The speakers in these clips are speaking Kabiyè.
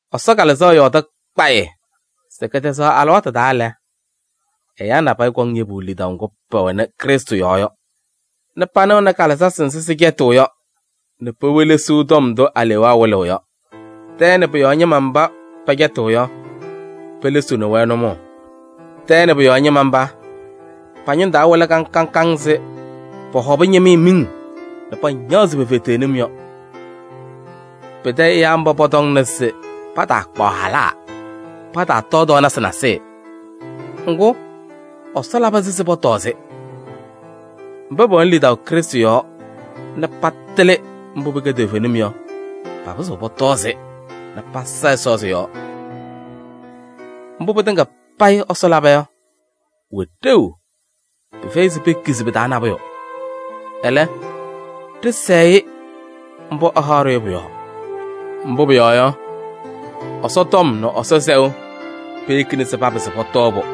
Ɛsɔ Kalɩzaɣ yɔɔdɩ kpayɩ se kɛtɛzaɣ alɩwaatʋ taa lɛ, ɛyaa nabɛyɛ kɔŋ yebu lidaʋ ŋgʋ pɛwɛnɩ Krɩstʋ yɔɔ yɔ nɛ panɩɣnɩ kalɩzasɩ nzɩ sɩcɛtɩɣ yɔ nɛ pewelesiɣ tɔm ndʋ alewaa wɩlɩɣ yɔ. Tɛɛ nɛ pʋ-yɔɔ ñɩma mba pɛcɛtɩɣ yɔ, pelesiɣni-wɛ nʋmɔʋ. Tɛɛ nɛ pʋ-yɔɔ ñɩma mba, pa-ñʋŋ taa wɩlɩ kaŋ kaŋ ɛzɩ pɔhɔbɩ ñɩmɩyɛ miŋ nɛ pañaɣzɩ pe-feteɣnim yɔ. Pɩtɛ ɛyaa mba pɔtɔŋnɩ se pataakpaɣ halaa, pataatɔɔ tɔɔnasɩ nasɩyɩ. Ŋgʋ, Ɛsɔ labɩ-sɩ se pɔtɔɔ-sɩ. Mba pɛwɛnɩ lidaʋ Krɩstʋ yɔɔ nɛ patɩlɩ mbʋ pɩkɛ toovenim yɔ, papɩzɩɣ pɔtɔɔ-sɩ nɛ pasa Ɛsɔ sɩ-yɔɔ. Mbʋ pɩtɩŋa payɩ Ɛsɔ laba yɔ, pʋwɛ ɖeu. Pɩfɛyɩ se pekizi pɩ-taa nabʋyʋ. Ɛlɛ, ɖɩsɛɛ-ɩ mbʋ ɛhaɣ-ɖʋ yɔ pʋ-yɔɔ. Mbʋ pʋyɔɔ yɔ, Ɛsɔtɔm nɛ Ɛsɔ sɛʋ peyekina se papɩsɩ pɔtɔɔ-pʋ.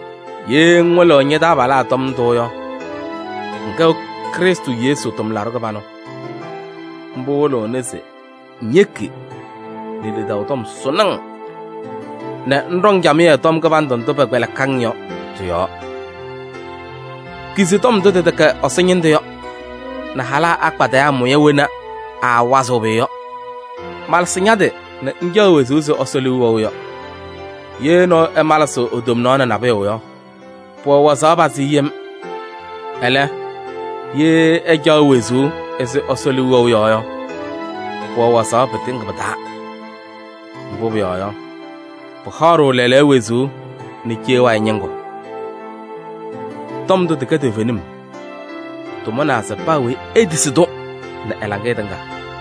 Ye ŋwɩlɩɣ ña-taabalaa tɔm ndʋ yɔ, ŋkɛɣ Krɩstʋ Yesu tʋmlaɖʋ kɩbanʋ. Mbʋ wɩlɩɣna se ŋyeki nɛ lidaʋ tɔm sʋʋnɩ-ŋ nɛ ŋɖɔŋ camɩyɛ tɔm kɩbandʋ ndʋ pɛkpɛlɩkɩ-ŋ yɔ tɩ-yɔɔ. Kizi tɔm ndʋ tɩtɛkɛ Ɛsɔ ñɩndʋ yɔ nɛ halaa akpadɩyaa mʋya wena aawazɩɣ pʋyʋ yɔ. Malɩsɩ ña-tɩ nɛ ŋcaɣ wezuu ɛzɩ Ɛsɔ liu wɛʋ yɔ. Ye nɔɔyʋ ɛmalɩsɩɣ e-tomnaɣ nɛ nabʋyʋ yɔ, pʋwɛ waɣzaɣ pazɩ yem. Ɛlɛ, ye ɛcaɣ wezuu ɛzɩ Ɛsɔ liu wɛʋ yɔ yɔ, pʋwɛ waɣzaɣ pɩtɩŋa pɩ-taa. Mbʋ pʋyɔɔ yɔ, pɩhaɣ-ɖʋ lɛɛlɛɛyɔ wezuu nɛ cee wayɩ ñɩŋgʋ. Tɔm ndʋ tɩkɛ toovenim. Tɩmʋnaa se paa weyi etisi-tʋ nɛ ɛ-laŋɩyɛ tɩŋa.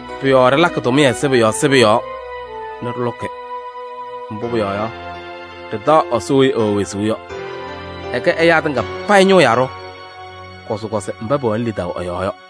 Pʋ-yɔɔ ɖɩlakɩ tʋmɩyɛ sɩbʋ yɔɔ sɩbʋ yɔɔ nɛ ɖɩlʋkɩ. Mbʋ pʋyɔɔ yɔ, ɖɩtaɣ Ɛsɔ weyi ɛwɛ wezuu yɔ. Ɛkɛ ɛyaa tɩŋa payɩ ñʋʋ yaɖʋ, kɔzɩkɔzɩ mba pɛwɛnɩ lidaʋ ɛ-yɔɔ yɔ.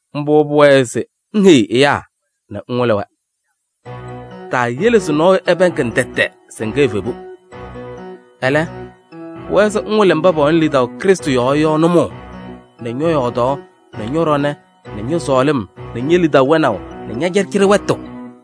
Mbʋ pʋwɛɛ se ŋheyi ɛyaa nɛ ŋwɩlɩ-wɛ. Taayele se nɔɔyʋ ɛpɛɛŋ-ŋ tɛtɛ se ŋkɛ evebu. Ɛlɛ, pʋwɛɛ se ŋwɩlɩ mba pɛwɛnɩ lidaʋ Krɩstʋ yɔɔ yɔ nʋmɔʋ nɛ ñɔ-yɔɔdaɣ nɛ ñɔ-ɖɔnɛ nɛ ñɔ-sɔɔlɩm nɛ ñe-lidaʋ wɛnaʋ nɛ ña-cɩɖɩcɩɖɩ wɛtʋ.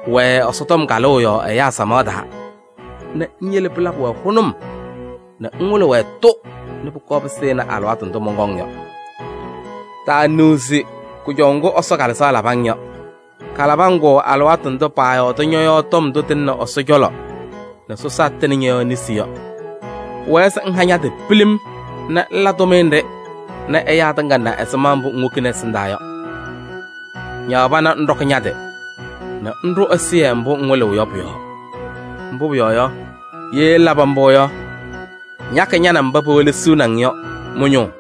Wɛɛ Ɛsɔtɔm kalʋʋ yɔɔ ɛyaa samaɣ taa nɛ ŋyele pɩlabɩ-wɛ hʋnʋm nɛ ŋwɩlɩ-wɛ-tʋ nɛ pʋkɔɔ pɩsɩnɩ alɩwaatʋ ndʋ mɔnkɔŋ yɔ. Taaniɣzi kʋjɔʋ ŋgʋ Ɛsɔ Kalɩzaɣ labɩ-ŋ yɔ. Kalabɩ-ŋ-kʋ alɩwaatʋ ndʋ paayɔɔdɩ ñɔ-yɔɔ tɔm ndʋ tɩlɩnɩ Ɛsɔ cɔlɔ nɛ sɔsaa tɩnɩ ñɔ-yɔɔ nesi yɔ. Pʋwɛɛ se ŋha ña-tɩ pilim nɛ ŋla tʋmɩyɛ nɖɩ nɛ ɛyaa tɩŋa na ɛzɩma mbʋ ŋwokini ɛsɩndaa yɔ. Ñaɣ pana ŋɖɔkɩ ña-tɩ nɛ ŋɖʋ ɛzɩyɛ mbʋ ŋwɩlɩɣ yɔ pʋ-yɔɔ. Mbʋ pʋyɔɔ yɔ, ye ŋlabɩ mbʋ yɔ, ŋyakɩ ña nɛ mba pewelesiɣni-ŋ yɔ mɩ-ñʋʋ.